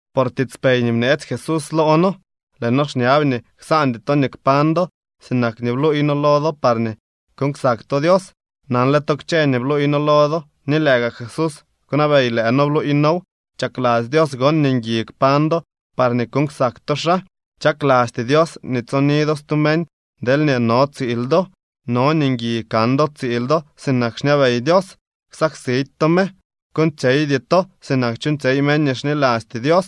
Por tiitspey nii bneetsy Jesús loo noo, lëë noo xñab nii ksaandy to nii kpañ do sinak nii bluuy noo lo do parñee kuuñ ksak to Dios. Nanle to kchë nii bluuy noo lo do, ni lëë gaa Jesús kwnabey lëë noo bluuy noow. Chakladzy Dios gon nii ngui kpañ do parñee kuuñ ksak to xaa. Chaklasty Dios nii tsoni do stu meñ deelñee no tsiil do. No nii ngui kan do tsiil do sinak xñabey Dios, ksaksidy to me. Kuuñtsyeydy to sinak chuuñtsyey meñ nii xnilasty Dios.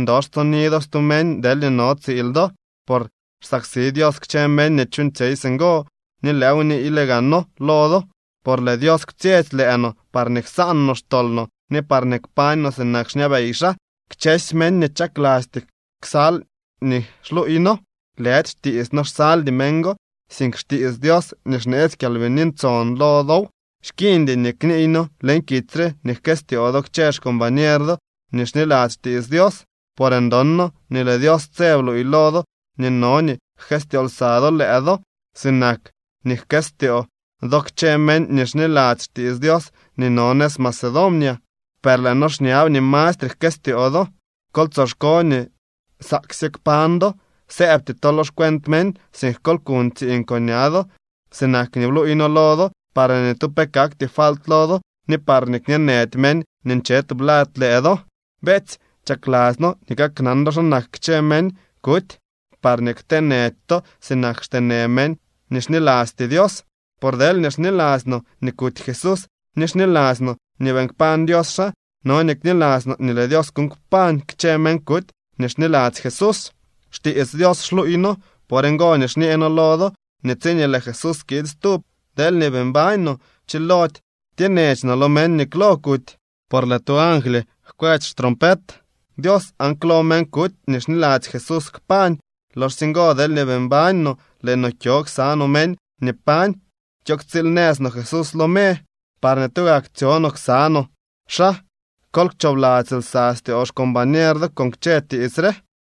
Ndox tsoni do stu meñ deelñee no tsiil do, por xsaksi Dios kchë meñ nii chuuñtsyey singo, ni lëëw niiyle gaa noo lo do. Por lëë Dios kwtsyetsy lëë no parñee ksaan no xtol no ni parñee kpañ no sinak xñabey xaa. Kchësy meñ nii chaklasty ksal nii xluuy noo, lëdy xtiits noo xsaldy meñ go, sink xtiits Dios nii xneetsy Kyalbini Ntson lo dow. Xkiiñdy nii kniiy noo leñ kitsy re nii jkëstyoo do kchë xcombañer do nii xniladzy xtiits Dios, por ndon noo nii lëë Dios tse bluuy lo do nii no nii jkëstyoo lsa do lëë do. Sinak nii jkëstyoo do kchë meñ nii xniladzy xtiits Dios nii no nëz Macedonia, per lëë noo xñab nii mastre jkëstyoo do. Kol tsoxko nii nsaaksye kpañ do. Sëëbty to lo xcuent meñ, sink kol kuñ tsiiñ con ña do sinak nii bluuy noo lo do, parñee ni tu pe kakty falt lo do ni parñee kñeenëdy meñ nii nche tublad lëë do. Beetsy, chakladzy noo nii kaknan do xa kak kchë meñ kuty parñee ktee nëdy to sinak xtee në meñ nii xnilasty Dios. Por deelñee xniladzy no nii kuty Jesús ni xniladzy no nii beeñ kpañ Dios xaa, no nii kniladzy no nii lëë Dios kuuñ kpañ kchë meñ kuty nii xniladzy Jesús. Xtiits Dios xluuy noo. Por ngo nii xñee noo lo do nii tsiñee lëë Jesús kiid stub, deelñee bii mbañ no, chilody tyenech no lo meñ nii klo kuty. Por lëë tu angly jkwetsy xtrompet Dios aan klo meñ kuty nii xniladzy Jesús kpañ. Loxsye ngo deelñee bii mbañ no, lëë no kyo ksa no meñ nii pañ, kyo ktsiil nëz no Jesús lo me, parñee tugak tsyo no ksa no xaa. Kol kchoobladzy lsa styoo xcombañer do con kchë tiits re.